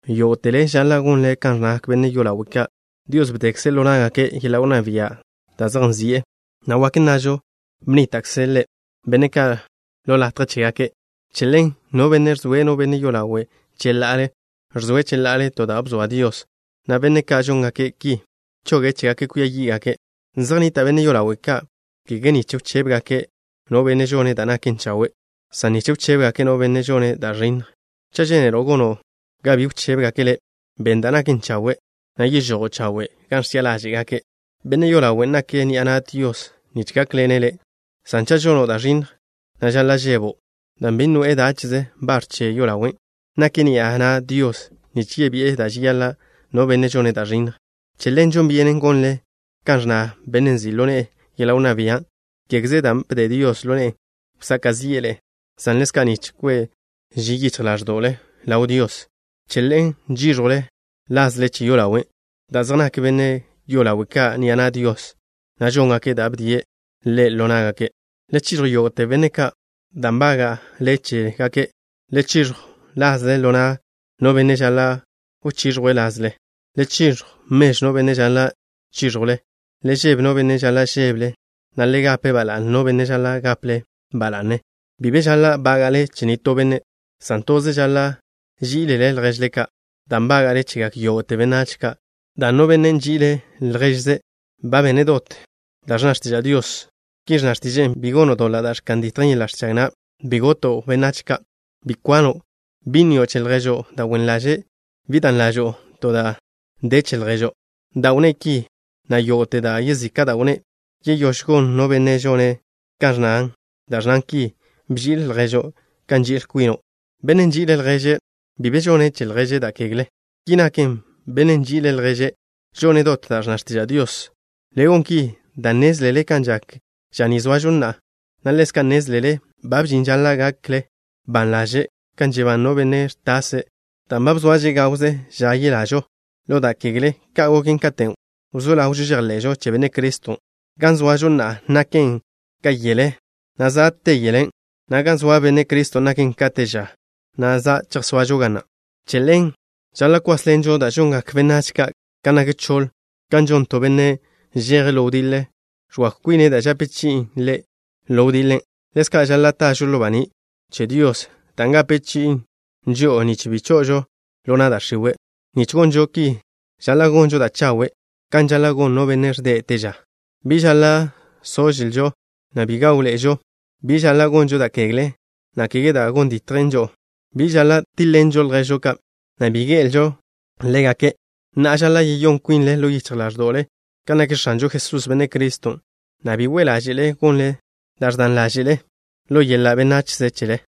Yógo'tele žaḻa' gonle kan ẕnnagak benne' yolawe' ka'. Dios bdekze' ḻo ná'gake' yeḻa' wnná bia' da' zej nzi'e, na' wak nnažo bnníta'kze' Ḻe' benne' ka' ḻo latje chégake'. Che ḻen, no benne' ẕzoe' no benne' yolawe' cheḻa'ale, ẕzoe' cheḻa'ale to da' bzoa Dios, na' benne' ka' žóngake' ki, choge' chégake' kwia yí'gake'. Zej nnita' benne' yolawe' ka', kege nich wchébegake' no benne' žone' da' naken chawe', san nich wchébegake' no benne' žone' da' ẕinnj. Cha' žénelo' gono' ga bi wchébegake' le', ben da' naken chawe', na' yežojo' chawe' gan ẕchi'a ḻáže'gake'. Benne' yolawen' nake' ni'a na' Dios nich gákḻene' le', san cha' žono' da' ẕinnj, na' žaḻa' žebo', dan' bi noe'e dáche'ze bar che yolawe'. Nake' ni'a na' Dios nich yebi'e da' žeyaḻa' no benne' žone' da' ẕinnj. Che ḻen žon byenen gonle kan ẕnna bennen' nzi' ḻo ne'e yeḻa' wnná bia', kégeze dan' bde Dios ḻo ne'e wsaka' zi'e ḻe'e, san ḻezka' nich kwe' ži yichj ḻáẕdo'le ḻaw Dios. Che ḻen žíẕjwle lazle che yolawe', dan' zej nak benne' yolawe' ka' ni'a na' Dios, na' žóngake' da' bdie' Ḻe' ḻo ná'gake'. Le chiẕjw yógo'te benne' ka' da' nbága'le chégake'. Le chiẕjw lazle ḻo na' no benne' žaḻa' wchiẕjwe' lazle. Le chiẕjw mežw no benne' žaḻa' chíẕjwlen. Le žebe no benne' žaḻa' žébele, na' le gape ba la'ne no benne' žaḻa' gaple ḻe' ba la'ne. Bi be žaḻa' bága'le che nitó benne', san toze žaḻa' ží'ilele lježle ka', da' nbága'le chegak yógo'te benách ka', dan' no benne' nži'ile' lježe' ba bene' dot da' ẕnna x̱tiža' Dios. Ki ẕnna x̱tiže'e: Bi gono' doḻa' da' ẕka'n ditjen yeḻa' ẕchag na'. Bi goto' benách ka'. Bi kwano'. Bi nnio' che lježo' da' wen ḻaže'. Bi dan ḻažo'o da' de che lježo'. Da' wnné' ki, na' yógo'te da' yezika' da' wnné', yeyóž gon no benne' žone' kan ẕnna da' ẕnnan ki: “Bži'il lježo' kan nži'il kwino'.” Bennen' nži'ile' lježe' bi be žone' che lježe' da' kegle. Ki naken, bennen' nži'ile' lježe' žone' dot da' ẕnna x̱tiža' Dios. Le gon ki dan' nnézlele kan žak ža ni zoažo na'a, na' ḻezka' nnézlele ba bžin ža žaḻa' gakle ban ḻaže' kan žebán no benne' ẕtase', dan' ba zoaže gawze ža yelažo ḻo da' kegle ka goken katen' wzó ḻawžo žejḻe'žo che Benne' Criston'. Gan zoažo na'a naken ka yele, na' za' te yelen', na' gan zoa Benne' Criston' naken ka te ža, na' za' chejsoažo ga na'. Che ḻen žaḻa' kwásḻenžo da' žongak benách ka' gan nak choḻ. Kan žon to benne' žeje' ḻo wdiḻe, ẕwakw kwine' da' žape chi'in ḻe' ḻo wdiḻe, ḻezka' žaḻa' tažo ḻo baní' che Dios, dan' gape chi'in žo'o nich bi cho'ožo ḻo na' da' x̱iwe'. Nich gonžo ki žaḻa' gonžo da' chawe' kan žaḻa' gon no benne' ẕde' te ža. Bi žaḻa' sožlžo, na' bi gáwḻe'ežo. Bi žaḻa' gonžo da' kegle, na' kege da' gon ditjen žo'o. Bi žaḻa' tíḻ-ḻenžo lježžo ka', na' bi gé'elžo ḻégake'. Na'a, žaḻa' yeyón kwinle ḻo yichj ḻáẕdo'le kan nak X̱anžo Jesús, Benne' Criston', na' bi we' ḻáže'le gonle da' ẕdan ḻáže'le ḻo yeḻa' benachze chele.